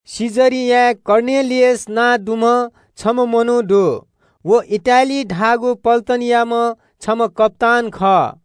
कैसरियाय् कर्नेलियस नां दुम्‍ह छम्‍ह मनू दु। व इटालिया धाःगु पल्‍टनयाम्‍ह छम्‍ह कप्‍तान खः।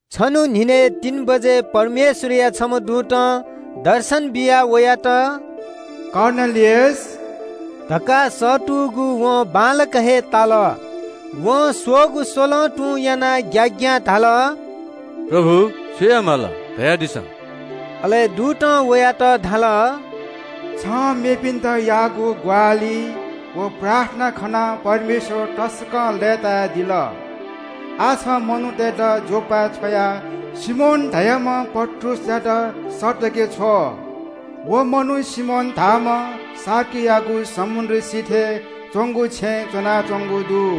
छन्‍हु न्‍हिनय् तीन बजे परमेश्‍वरया छम्‍ह दूतं दर्शन बियाः वयात – “कर्नेलियस” धकाः सःतूगु वं बांलाक हे ताल। वं स्‍वःगु स्‍वलं तुं यानाः ग्‍याग्‍यां धाल – “प्रभु, छु याये माल, धयादिसँ?” अले दूतं वयात धाल – “छं मेपिन्‍त याःगु ग्‍वाहालि व प्रार्थना खनाः परमेश्‍वर तसकं लय्‌तायादिल। आः छं मनूतय्‌त योप्‍पाय् छ्वयाः सिमोन धाःम्‍ह पत्रुसयात सःतके छ्व। व मनू सिमोन धाःम्‍ह छेंगूया ज्‍या याइम्‍हय्‌सिगु समुद्र सिथय् च्‍वंगु छेँय् च्‍वनाच्‍वंगु दु।”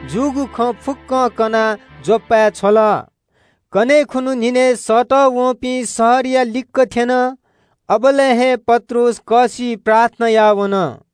जूगु खँ फुक्‍कं कनाः योप्‍पाय् छ्वल। कन्‍हय् खुन्‍हु न्‍हिनय् सःतःवंपिं शहरया लिक्‍क थ्‍यन। अबलय् हे पत्रुस कःसिइ प्रार्थना याः वन।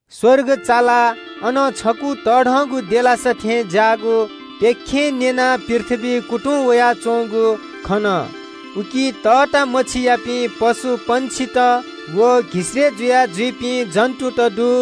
स्‍वर्ग चालाः अनं छकू तःधंगु देलासा थें ज्‍याःगु प्‍यखें कुन्‍चाय् ज्‍वनाः पृथ्‍वीइ कुतुं वयाच्‍वंगु खन। उकी तःता मछियापिं पशु, पंक्षित व घिसय्‌ जुया जुइपिं जन्‍तुत दु।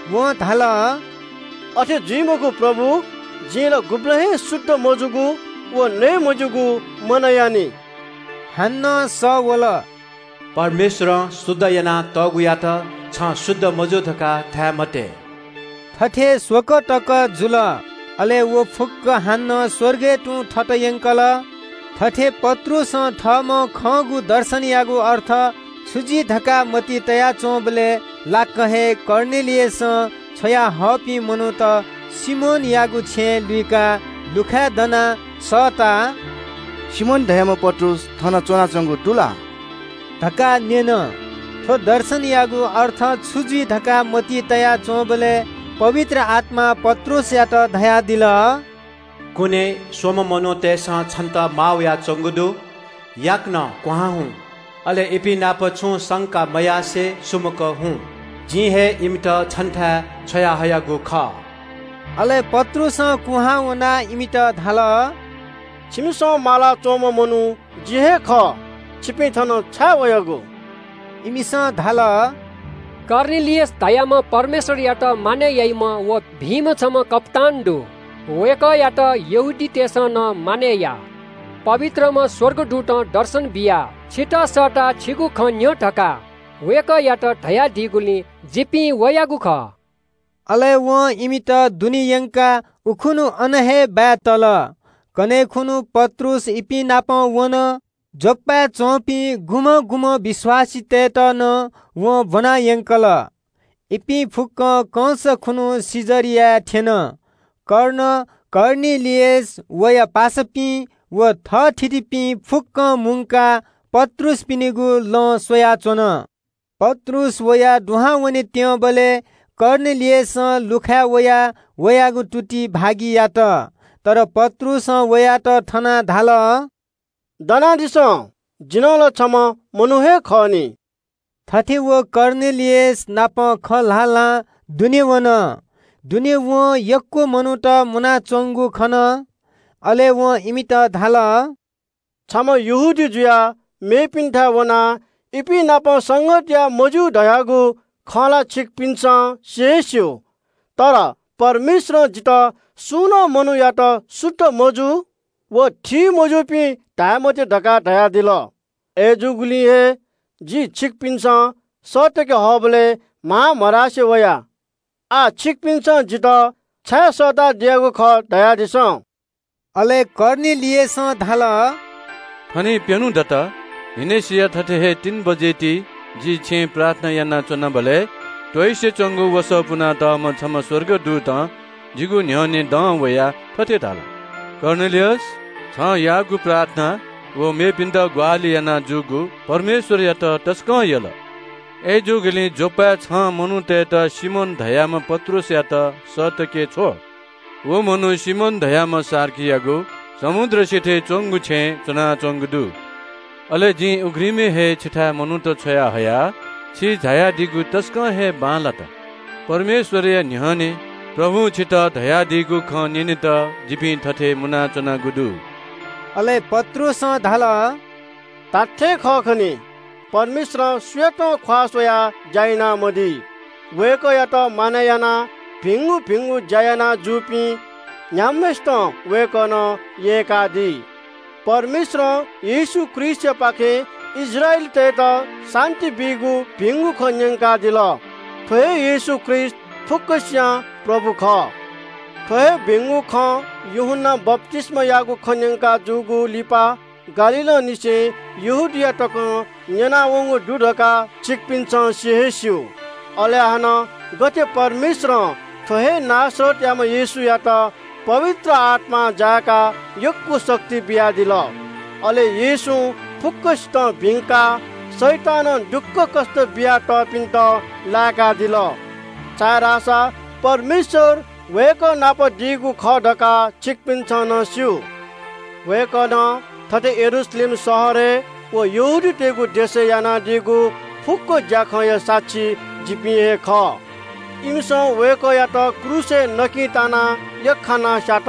वं धाल – “अथे जुइ मखु, प्रभु। जिं ला गुबलें हे शुद्ध मजूगु व नये मज्‍यूगु मनयानि।” हानं सः वल – “परमेश्‍वरं शुद्ध याना तःगुयात छं शुद्ध मजू धकाः धाये मते।” थथे स्‍वकः तक जुल। अले व फुक्‍क हानं स्‍वर्गय् तुं थत यंकल। थथे पत्रुसं थःम्‍हं खंगु दर्शनयागु अर्थ छु जुइ धकाः मतिइ तया च्‍वंबलय् लाक्‍क हे कर्नेलियसं छ्वयाहःपिं मनूत सिमोनयागु छेँ लुइकाः लुखाय् दनाः सःताः “सिमोन धाःम्‍ह पत्रुस थन च्‍वनाच्‍वंगु दु ला” धकाः न्‍यन। थ्‍व दर्शनयागु अर्थ छु जुइ धकाः मतिइ तया च्‍वंबलय् पवित्र आत्‍मां पत्रुसयात धयादिल – “कुने स्‍वम्‍ह मनूतय्‌सं छन्‍त माः वयाच्‍वंगु दु। याकनं क्‍वहां हुँ, अले इपिं नाप छुं संका मयासें सुमुक हुँ। जिं हे इमित छन्‍थाय् छ्वयाहयागु खः।” अले पत्रुसं कुहां वनाः इमित धाल – “छिमिसं मालाच्‍वंम्‍ह मनू जि हे खः। छिपिं थन छाय् वयागु?” इमिसं धाल – “कर्नेलियस धाःम्‍ह परमेश्‍वरयात मानय् याइम्‍ह व भिंम्‍ह छम्‍ह कप्‍तान दु। वय्‌कःयात यहूदीतय्‌सं नं मानय् याः। पवित्रम्‍ह स्‍वर्गदूतं दर्शन बियाः छितः सःताः छिगु खँ न्‍यँ धकाः वय्‌कःयात धयादीगुलिं जिपिं वयागु खः।” अले वं इमित दुने यंकाः उखुन्‍हु अन हे बाय् तल। पत्रुस कर्नेलियसयात नापलाः वंगु कन्‍हय् खुन्‍हु पत्रुस इपिं नाप वन। योप्‍पाय् च्‍वंपिं गुम्‍हं गुम्‍हं विश्‍वासीतय्‌त नं वं ब्‍वनायंकल। इपिं कंस खुन्‍हु कैसरियाय् थ्‍यन। कर्नेलियस, वया पासापिं व थःथितिपिं फुक्‍क मुंकाः पत्रुसपिनिगु लँ स्‍वयाच्‍वन। पत्रुस दुहां वनेत्‍यंबलय् कर्नेलियसं लुखाय् वयाः वयागु तुति भागि यात। अय्‌नं पत्रुसं वयात थनाः धाल – “दनादिसँ, जि नं ला छम्‍ह मनू हे खः नि।” थथे व कर्नेलियस नाप खँ ल्‍हाल्‍हां दुने वन। दुने वं यक्‍व मनूत मुनाच्‍वंगु खन। अले वं इमित धाल – “छम्‍ह यहूदी जुयाः मेगु जातियापिन्‍थाय् वनाः इपिंनापं संगत याये मज्‍यू धयागु खँ ला छिकपिन्‍सं सि हे स्‍यू। अय्‌नं परमेश्‍वरं जितः सुं मनूयात शुद्ध मजू व थीमज्‍यूपिं धाये मते धकाः धयादिल। अय्‌जूगुलिं हे जि छिकपिन्‍सं सःतके हःबलय् म्‍हां मधासे वया। आः छिकपिन्‍सं जितः छाय् सःतादियागु खः, धयादिसँ।” अले कर्नेलियसं धाल – “थनिं प्‍यन्‍हु दत, न्‍हिनेसिया तीन बजे ति जि छेँय् प्रार्थना यानाच्‍वनाबलय् त्‍वइसे च्‍वंगु वसः पुनातःम्‍ह छम्‍ह स्‍वर्गदूतं जिगु न्‍ह्यःने दं वयाः थथे धाल – ‘कर्नेलियस, छं याःगु प्रार्थना व मेपिन्‍त ग्‍वाहालि याना जूगु परमेश्‍वरयात तसकं यल। अय्‌जूगुलिं योप्‍पाय् छं मनूतय्‌त सिमोन धाःम्‍ह पत्रुसयात सःतके छ्व। व मनू सिमोन धाःम्‍ह छेंगूया ज्‍या याइम्‍हय्‌सिगु समुद्र सिथय् च्‍वंगु छेँय् च्‍वनाच्‍वंगु दु।’ अले जिं उघ्रिमय् हे छिथाय् मनूत छ्वयाहया। छि झायादीगु तसकं हे बांलात। परमेश्‍वरया न्‍ह्यःने प्रभुं छितः धयादीगु खँ न्‍यनेत जिपिं थथे मुनाच्‍वनागु दु।” अले पत्रुसं धाल – “धात्‍थें खः खनी, परमेश्‍वरं सुयातं ख्‍वाः स्‍वयाः ज्‍या यानामदी। वय्‌कःयात मानय् यानाः भिंगु भिंगु ज्‍या याना जूपिं न्‍ह्याम्‍हय्‌सितं वय्‌कलं यय्‌कादी। परमेश्‍वरं येशू ख्रीष्‍टयापाखें इस्राएलीतय्‌त शान्‍ति बीगु भिंगु खँ न्‍यंकादिल। थ्‍व हे येशू ख्रीष्‍ट फुक्‍कसियां प्रभु खः। थ्‍व हे भिंगु खँ यूहन्‍नां बप्‍तिस्‍मायागु खँ न्‍यंकाजूगु लिपा गालीलंनिसें यहूदिया तकं न्‍यनावंगु दु धकाः छिकपिन्‍सं सि हे स्‍यू। अले हानं गथे परमेश्‍वरं थ्‍व हे नासरतयाम्‍ह येशूयात पवित्र आत्‍मां जाय्‌काः यक्‍व शक्ति बियादिल। अले येशूं फुक्‍कसितं भिंकाः शैतानं दुःखकष्‍ट बियातःपिन्‍त लाय्‌कादिल। छाय्‌धाःसा परमेश्‍वर वय्‌कः नाप दीगु खः धकाः छिकपिन्‍सं नं स्‍यू। “वय्‌कलं थथे यरूशलेम शहरय् व यहूदियाय् यानादीगु फुक्‍क ज्‍याखँया साक्षी जिपिं हे खः। इमिसं वय्‌कःयात क्रूसय् यख्‍खानाः स्‍यात।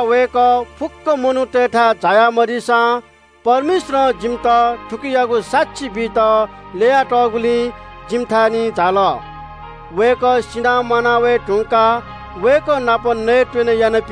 वय्‌कः फुक्‍क मनूतय्‌थाय् झाया मदी। परमेश्‍वरं जिमित थुकियागु साक्षी बीत ल्‍यया तःगुलिं जिमिथाय् झाल। अले जिमिसं वय्‌कः नाप नयेत्‍वने याना।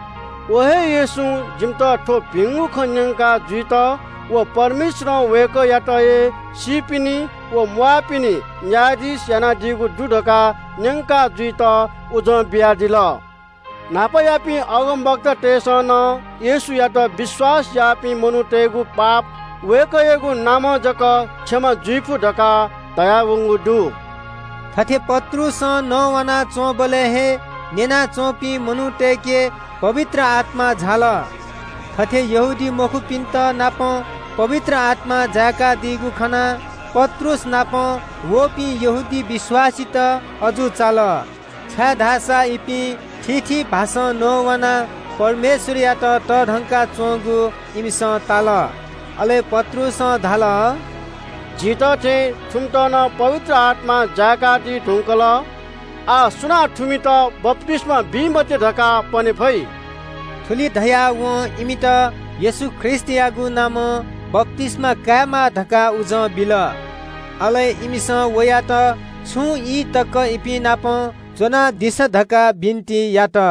व हे येशूं जिमित थ्‍व भिंगु खँ न्‍यंका जुइत व परमेश्‍वरं वय्‌कःयात हे सीपिनि व म्‍वाःपिनि न्‍यायाधीश यानादीगु दु धकाः न्‍यंका जुइत उजं बियादिल। न्‍हापायापिं अगमवक्तातय्‌सं नं येशूयात विश्‍वास याःपिं मनूतय्‌गु पाप वय्‌कःयागु नामं जक क्षमा जुइफु धकाः धयावंगु दु।” थथे पत्रुसं नवानाच्‍वंबलय् हे न्‍यना च्‍वंपिं मनूतय्‌के पवित्र आत्‍मा झाल। थथे यहूदीमखुपिन्‍त नं पवित्र आत्‍मां जाय्‌कादीगु खनाः पत्रुस नाप वःपिं यहूदी विश्‍वासीत अजू चाल, छाय्‌धाःसा इपिं थीथी भाषां नवानाः परमेश्‍वरयात तःधंका च्‍वंगु इमिसं ताल। अले पत्रुसं धाल – “झीत थें थुमित नं पवित्र आत्‍मां जाय्‌कादी धुंकल। आः सुनां थुमित बप्‍तिस्‍मा बी मते धकाः पने फइ?” थुलि धयाः वं इमित येशू ख्रीष्‍टयागु नामं बप्‍तिस्‍मा कायेमाः धकाः उजं बिल। अले इमिसं वयात छुं ई तक इपिंनापं च्‍वनादिसँ धकाः बिन्‍ति यात।